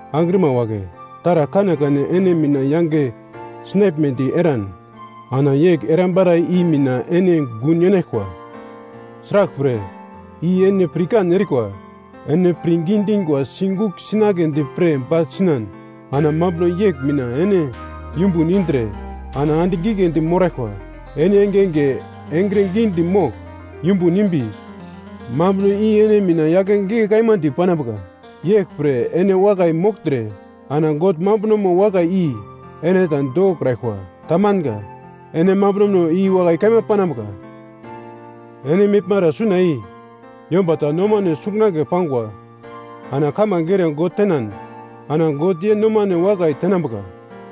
Angrima wagle, taragl kanekane ene mina yange sinaglmedi eran, ana yegl erambara i mina ene gun yenaglkwa. Sraglpre, i ene pirkan erikwa, ene pirngi dingwa sigugl sinagledi pre bagl sinan, ana mambuno yegl mina ene yumbun indre ana andigl giglendi moraglkwa. Ene engenge engre gidi mogl yumbun imbi, mambuno i ene mina yake gigle kaima di panambuka. Yeglpre ene wakai mogltre ana God mambunomo wakai i ene ta dokokraglkwa. Tamanga. Ene mambunono i wakai kaima panambuka. Ene meglmara suna i yomba ta nomane sungunagle pangwa ana kamange ere God tenan ana God ye nomane wakai tenambuka.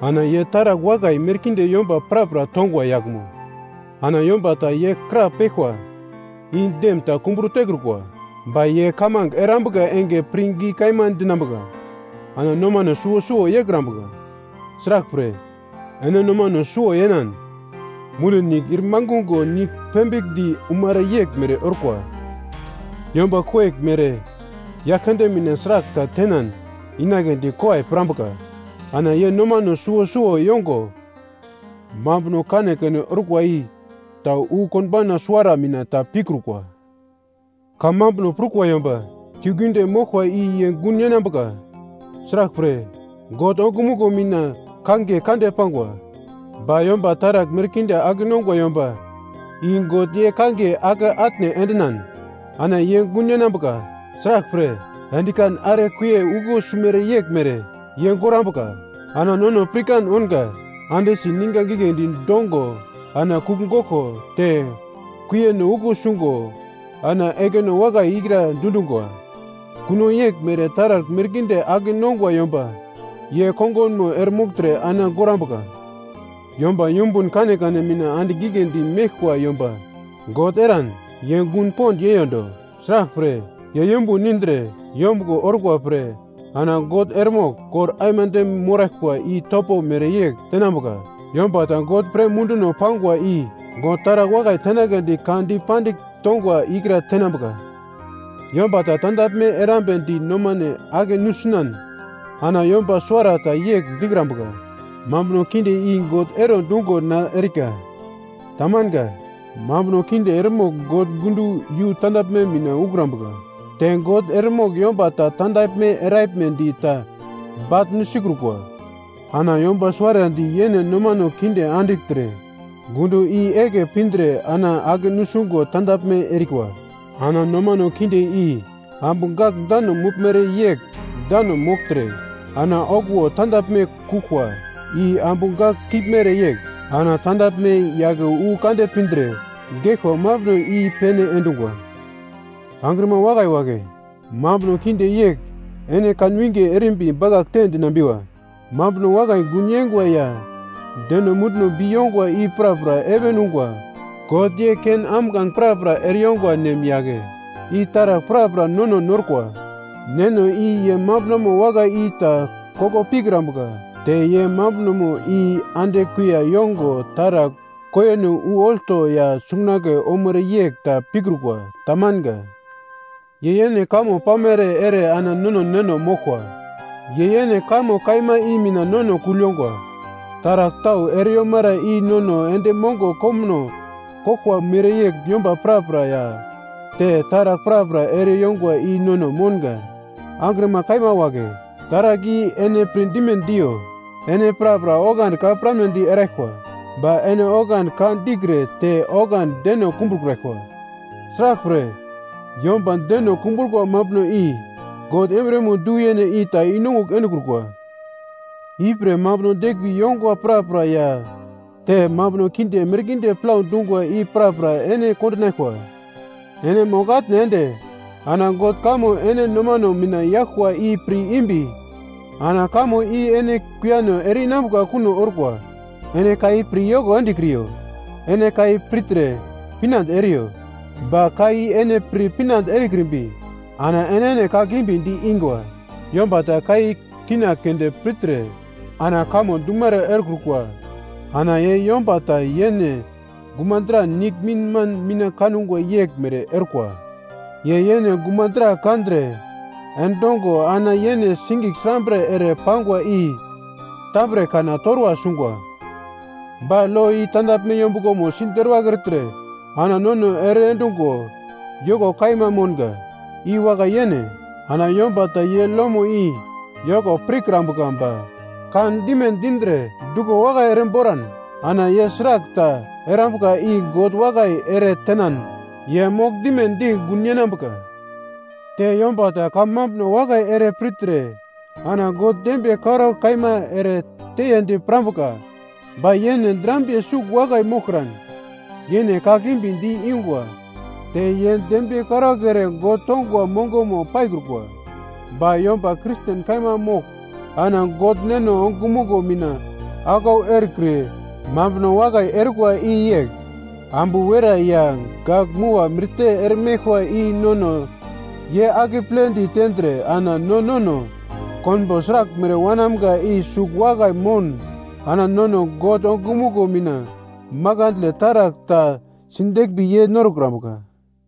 Ana ye taragl wakai merkinde yomba prapra tongwa yaglmo. Ana yomba ta ye krapeglkwa i dem ta kumburo tekrukwa. Ba ye kamange erambuka enge pirngi kaima dinambuka ana nomane suwo suwo yeikrambuka. Sraglpre, ene nomane suwo yenan, mundi nigl ir mangungo nigl pembigldi umere yeglmere orkwa. Yomba koyeglmere Yaglkande mina sragl ta tenan inagledi kowai pirambuka. Ana ye nomane suwo suwo yongo, mambuno kanekane orkwa i ta wu konbauna suwara mina ta pikrukwa. Kamambuno prukwa yomba kiuglgiunde moglkwa i ye gun yenambuka, sraglpre, God ongumuglo mina kangiye kande pangwa. Ba yomba taragl merkinde ake nongwa yomba i God ye kangiye ake atne endinan ana ye gun yenambuka, sraglpre, endikan are kuiye uglo simere yeglmere ye gorambuka. Ana nono pirkan ounga, ande si ninga giglendi dongo ana kugl goglko te kuiyeno uglo sungo ana ekino wakai ikra dundungwa. Kuno yeglmere taragl merkinde ake nongwa yomba ye kongunmo eremogltre ana gorambuka. Yomba yumbun kanekane mina andigl giglendi meglkwa yomba God eran ye gun pond yeiyondo. Sraglpre, ye yumbun indre yombuglo orkwa pre ana God eremogl kor aimande moraglkwa i topo mereyegl tenambuka. Yomba ta God pre munduno pangwa i God taragl wakai tenagledi ka dipandigl tongwa ikra tenambuka. Yomba ta tandaglme erambedi nomane ake nusinan ana yomba suwarata yegl dikrambuka, “Mambuno kinde i God ero dungo na erika.” Tamanga. Mambuno kinde eremogl God gundo yu tandaglme mina ukrambuka, te God eremogl yomba ta tandaglme eraglmedi ta baglnu sikrukwa. Ana yomba suwarandi yene nomane kinde andigltre gundo i eglke pindre ana ake nusungo tandaglme erikwa. Ana nomane kinde i ambu gak dano meglmere yegl dano mogltre, ana okuwo tandaglme kuglkwa i ambu gak kiglmere yegl. Ana tandaglme yake wu kande pindre geglkwa mambuno i-pene endungwa. Angrima wakai wagle, mambuno kinde yegl ene kanwinge erimbi bakaglte dinambiwa. Mambuno wakai gun yenga ya deno munduno bi yongwa i prapra heven ungwa. God ye ken ambuglange prapra ereyongwa nem yagle i taragl prapra nono norkwa. Neno i ye mambunomo wakai i ta koko pikrambuka te ye mambunomo i ande kuiya yongo taragl kuiyano wu olto ya sungunagle omere yegl ta pikrukwa. Tamanga. Ye yene kamo pamere ere ana nono neno moglkwa. Ye yene kamo kaima i mina nono kugl yongwa. Taragl tau ere yomara i nono endi mongo komuno koglkwa mereyegl yomba prapra ya te taragl prapra ere yongwa i nono mounga. Angrima kaima wagle, taragl i ene pirdime diyo. Ene prapra oglandi ka piramnedi eraglkwa, ba ene oglandi ka dikre te oglandi deno kumbrokraglkwa. Sraglpre, yomba deno kumbrukwa mambuno i God embriyemo du-yene i ta i-nongugl endekrukwa. Ipre mambuno deglmbi yongwa prapra ya te mambuno kinde merkinde plau dungwa i prapra ene kondinaglkwa. Ene mogl-atne ende ana God kamo ene nomano mina yaglkwa i pir imbi ana kamo i ene kuiyano ere-inambuka kuno orkwa. Ene ka i pir yoko endekriyo. Ene ka i pirtre pinande eriyo. Ba ka i ene pir pinande erekrimbi ana enene kakimbi di-ingwa. Yomba ta ka i kina keunde pirtre ana kamo dumere erekrukwa ana ye yomba ta yene gumadra niglminman mina kangwa yeglmere orkwa. Ye yene gumadra kandre endongo ana yene sigigl srambre ere pangwa i tambre kana torwa sungwa. Ba lo i tandaglme yombuglomo siderwagl ertre ana nono ere endungo yoko kaima mounga, i wakai-yene. Ana yomba ta ye lomo i yoko pirkrambuka ba kandime dindre duglo wakai ere boran ana ye sragl ta erambuka i God wakai ere tenan ye mogl dimedi gun yenambuka. Te yomba ta kamambuno wakai ere pirtre ana God dembiye karaugl kaima ere teyedi pirambuka, ba ye yene drambiye sugl wakai moglkran, yene kakimbi di-ingwa te ye dembiye karaugl ere God tongwa mongomo paikrukwa. Ba yomba Kristen kaima mogl ana God Neno ongumuglo mina aglau erekre mambuno wakai erikwa i yegl: Ambu werai ya gak-mua mirte eremeglkwa i nono ye akeple di tendre ana no nono konbo sraglmere wanamga i sugl wakai moun ana nono God ongumuglo mina makandle taragl ta sideglmbi yei norokrambuka.